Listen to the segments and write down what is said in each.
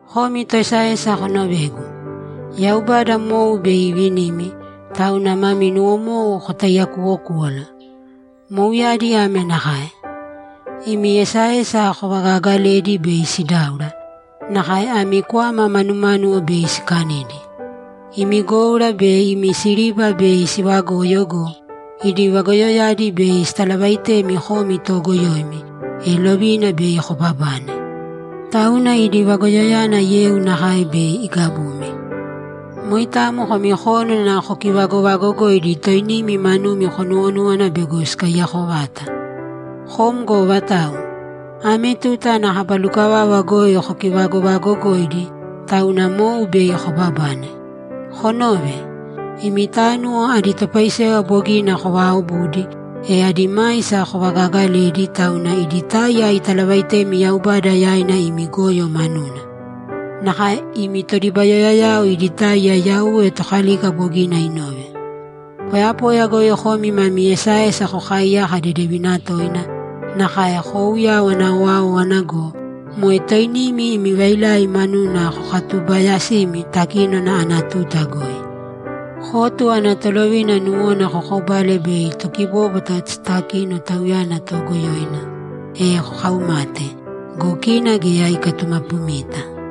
Komi toesaesa konovēgu. Yaubada mou bei ivinimi, tauna mami nuwomou kotaiyakuwokūwala! Mouyadi ame nakae: Imi esaesa kovagaagaledi bei sidáura, nakae ami kwama manumánuwo bei sikanidi. Imi goura be imi siriba bei sivagoyo go, idi vagoyoyadi bei sitalavaitemi komi toogoyoimi, e lovina bei kobabane. Tauna idi vagoyoyana yeu nakae bei igabumi. Moitamo komi kónana kokivagovagogoidi toinimi manumi konuwonúwana bego sikaiyako vata. Kom go vatau? Ame tuta ana kaba lukavava goi kokivagovaagogoidi, tauna mou bei kobabane. Konōve! Imi tánuwo adi topaisewa bogina kovaaobudi, e adi maisa kovagagaledi, tauna idi táiya italavaitemi Yaubada yaina imi goyo manuna. Nakae imi todibayoyayao idi táiya Yauwe Tokalika bogina inove. Poyapoya goi komi mami esaesa kokaaiyaka dedevina toina, nakae kouyawana owáowana go, moe toinimi imi vailai manuna kokatubaayasimi takínona ana tuta goi. Kotu ana tolovina nuwona kokobale bei tokibóbwata sitakino tauyana toogoyoina, e kokaumate. Go kina geya ikatumapumita.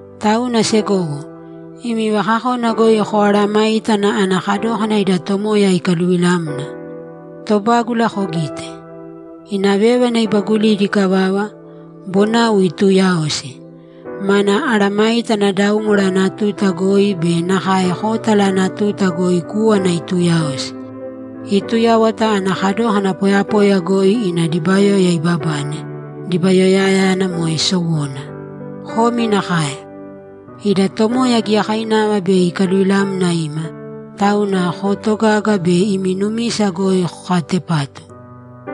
Tauna segowo, imi vakakona goi koaaramāitana ana kadókana ida Tomoya ikaluvilamna. Tobágula kogīte. Ina vévana ibagulidi ikavava, bonau ituuyaosi. Mana mesayágana daúmwara ana tuta goi be nakae kótala ana tuta goi kúwana ituuyaosi. Iituyáwata ana kadókana poyapoya goi ina dibayoya ibabane, dibayoyayana moe sowona. Komi nakae. Ida Tomoya giyakainava bei ikaluvilamna ima, tauna kootogāga be imi numisa goi kokaatepātu.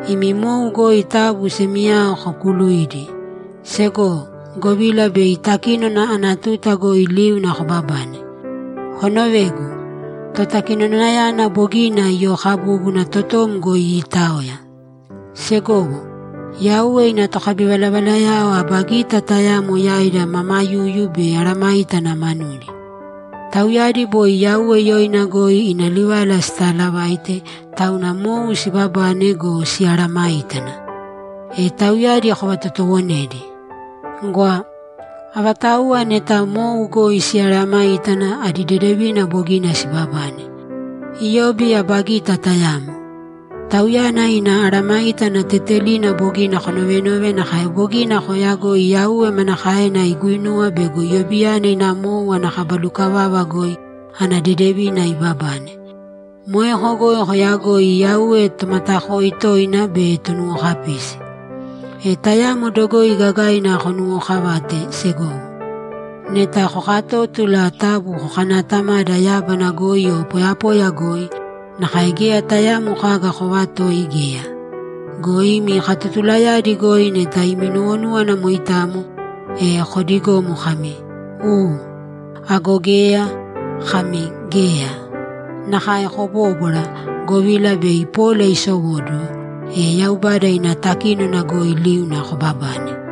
Imi mou goi taabu semiyao kokuuluīdi, segowo, govila bei takínona ana tuta goi liuna kobabane. Konovēgu! Totakinonayana bogina iyookabúbuna, totom goi iitaoya. Segowo, Yauwe ina tokabivalavalayao aba gita tayamo yaida mamayuyu be mesayágana manudi. Tauyadi boi Yauwe yoina goi ina livala sitaalavaite, tauna mou sibabane go, simeesayágana. E tauyadi kovatotoowonēdi. Gwa! Avatauwa neta mou goi simeesayágana, adi dedevina bogina sibabane. Iyobi aba gita tayamo. Tauyana ina mesayágana tetelina bogina konovenove nakae bogina kooyagoi Yauwe manakaena iguinuwa bego Iyobiyana ina mou ana kaba lukavava goi ana dedevina ibabane. Moeko goi koyagoi Yauwe Tomatakoi toina be Tonuwokapisi. E tayamo dogoi gagaina konuwookavāte, segowo. Neta kokatótula, taabu kokanaatamāda yábana goi o poyapoya goi, nakae geya tayaamo kaga koovatōi geya. Go imi katotulayadi goi neta imi nuwonúwana moitamo, e koodigōmo kami, ‘U.’ Ago geya, kami, ‘Geya.’ Nakae kobóbwara, govila bei pola isowóduwo, e Yaubada ina takínona goi liuna kobabane.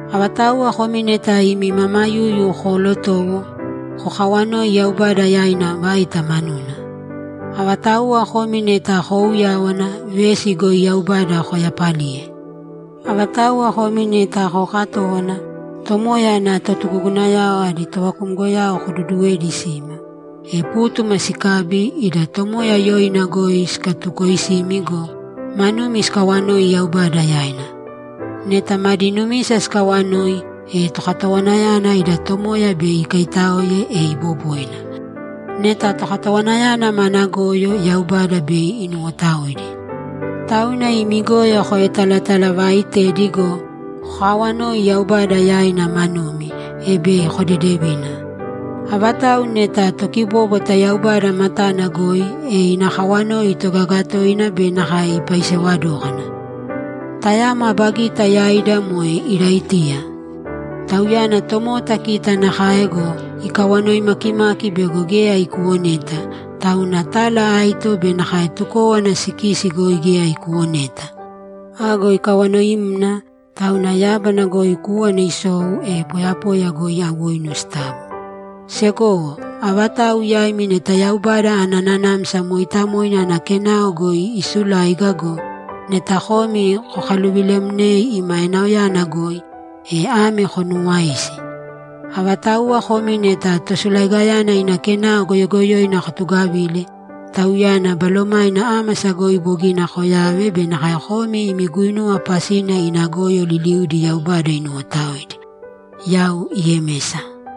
Avatauwa komi neta imi mamayuyu koolotowo, kokawanōi Yaubada yaina vaita manuna. Avatauwa komi neta koouyáwana, vesi goi Yaubada koyapalīye. Avatauwa komi neta kookatówana, Tomoya ana totugugunayao adi tovakumgoyao koduduwēdi sima, e pútuma sikabi, ida Tomoya yoina goi sikatukoisimi go, manumi sikawanoi Yaubada yaina. Neta madi numisa sikawanoi, e tokatowanayana ida Tomoya bei ikaitáoe, e iboboina. Neta tokatowanayana mana goyo, Yaubada bei inuwotaoidi. Tauna imi goyo koetalatalavaaitēdi go, kokaawanōi Yaubada yaina manumi, e bei kodedevina. Avatau neta tokibóbwata Yaubada matana goi, e ina kawanoi itogaga toina be nakae ipaisewa dókana. Tayamo aba gita yaida moe Iraitiya. Tauyana tomota kita nakae go, ikawanoi makimaki bego geya ikuwoneta, tauna tala aito be nakae tukówana sikisi goi geya ikuwoneta! Ago ikawanoimna, tauna yábana goi kúwana isou, e poyapoya goi awoinu sitabo. Segowo, avatau yaimi neta Yaubada ana Nanamsa Mooitamoina ana kenao goi isuláiga go, neta komi kokaluvilemnei ima enaoyana goi, e ame konuuwāisi: Avatauwa komi neta tosulaigayana ina kenao goyogoyoina kotugavile, tauyana balomaina ámasa goi bogina koyave be nakae komi imi guinuwa pasina ina goyo liliudi Yaubada inuwotaoidi. Yau Yemesa